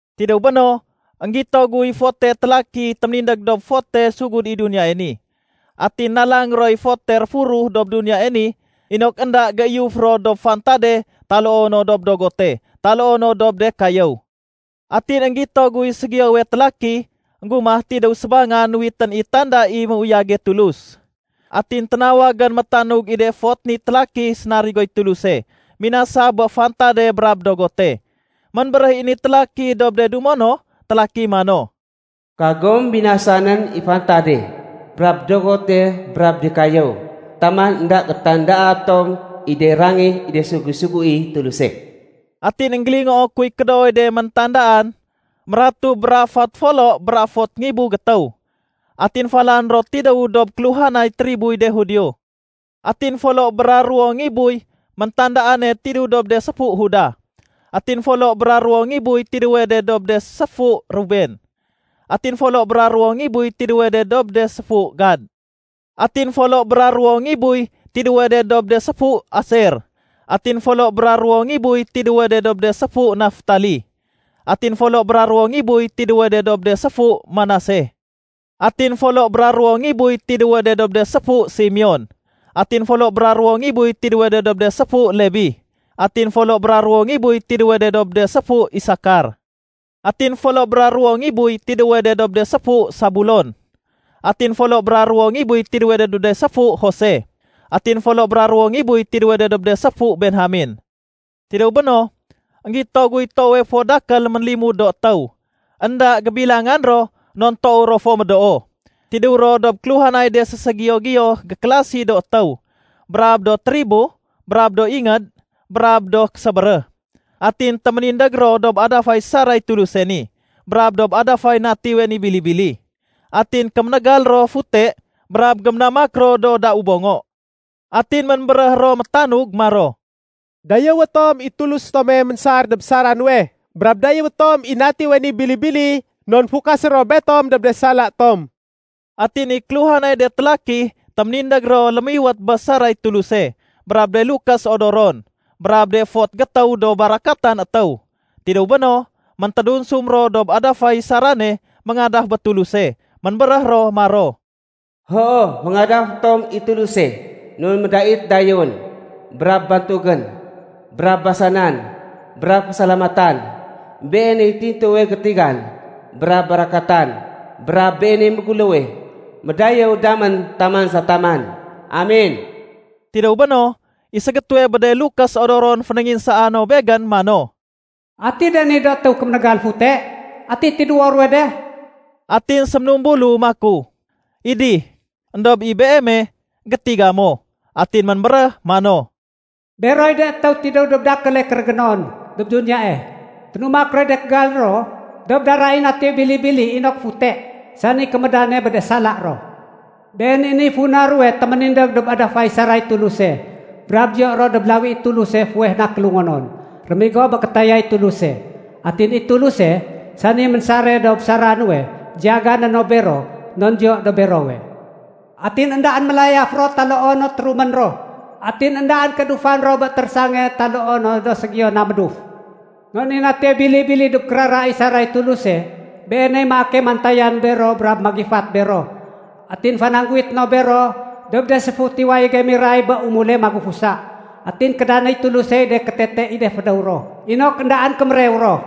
Tidéw béno, énggito guy fote télaki téménindég dob fote sugud i duniyae ni. Atin nalang roy fote réfuruh dob duniyae ni inok énda géiyuf ro dob fantade taloo no dob dogote taloo no dob de kayéw. Atin énggito guy ségiyowe télaki énggumah tidéw sébangan nuwitén i tanda i méuyage Tulus. Atin ténawagén métanug i de fot ni télaki sénarigoy Tuluse minasa bé fantade brab dogote. Ménbéréh i ni télaki dob de dumo no télaki mano, “Kagom binasanén i fantade brab dogote brab de kayéw taman énda gétandaa tom i de rangih i de sugu-suguéy Tuluse.” Atin énggélingoo kuy kédooy de méntandaan, mératuh bra fot folo bra fot ngibu gétéw. Atin falan ro tidéw dob kéluhanay triboy de Judio. Atin folo bra ruwo ngibuy méntandaane tidéw dob de séfu Judah. Atin folo bra ruwo ngibuy tidéwe de dob de séfu Ruben. Atin folo bra ruwo ngibuy tidéwe de dob de séfu Gad. Atin folo bra ruwo ngibuy tidéwe de dob de séfu Aser. Atin folo bra ruwo ngibuy tidéwe de dob de séfu Naftali. Atin folo bra ruwo ngibuy tidéwe de dob de séfu Manase. Atin folo bra ruwo ngibuy tidéwe de dob de séfu Simeon. Atin folo bra ruwo ngibuy tidéwe de dob de séfu Lebi. Atin folo bra ruwo ngibuy tidéwe de dob de séfu Isakar. Atin folo bra ruwo ngibuy tidéwe de dob de séfu Sabulon. Atin folo bra ruwo ngibuy tidéwe de dob de séfu Jose. Atin folo bra ruwo ngibuy tidéwe de dob de séfu Benjamen. Tidéw béno, énggito guy toowe fo dakél ménlimud do étéw. Enda gébilangan ro non toow ro fo médoo. Tidéw ro dob kéluhanay de séségiyo-giyo gékélasi do étéw, brab do tribo, brab do ingéd, brab do késébéréh. Atin téménindég ro dob adafay saray Tuluse ni brab dob adafay Natiwe ni Bili-bili. Atin kéménégal ro fute brab géménamak ro do dau bongo. Atin ménbéréh ro métanug maro, “Dayéwé tom i Tulus tome ménsar dob sara nuwe, brab dayéwé tom i Natiwe ni Bili-bili non fukasé ro betom dob de sala tom.” Atin i kéluhanay de télaki téménindég ro lémiwét bé saray Tuluse brab de lukés odoron brab de fot gétéw do barakatan étéw. Tidéw béno, méntédunsum ro dob adafay sarane méngadaf bé Tuluse. Ménbéréh ro maro, “Hoo, féngadafé tom i Tuluse non médait dayéwén brab bantugén brab basanan brab fésalamatan. Beeney tintuwe gétigan brab barakatan, brab Beeney méguléwe. Médayéw damén taman sa taman. Amen!” Tidéw béno, i ségétéwe bé de lukés odoron fénénginsaa no begén mano, “Ati de ni do étéw kéménégal fute, ati tidéwo ruwe de?” Atin séménumbulu maku, “Idih. Endob i beeme, gétiga mo.” Atin ménbéréh mano, “Beroy de étéw tidéw dob dakéle kérégénon dob duniyae. Ténumak roy de kégal ro dob dara i Natiwe Bili-bili inok fute, sani kémédane bé de sala ro. Been i niy funa ruwe téménindég dob adafay saray Tuluse brab diyo ro dob lawi i Tuluse fuweh na kélungonon rémigo bé kétayay Tuluse. Atin i Tuluse, sani ménsare dob sara nuwe, diyagané no bero, non diyo dob berowe. Atin éndaén mélayaf ro taloo no térumén ro. Atin éndaén kéédufan ro bé térésange taloo no do ségiyo na méduf. Non i Natiwe Bili-bili dob kérara i saray Tuluse, Beeney maake mantayan bero brab magifat bero. Atin fanangguwité no bero dob de séfut i wayége miray bé umule magufusa. Atin kédanéy Tulusey de kétete i de fédéw ro inok éndaén kémérew ro.”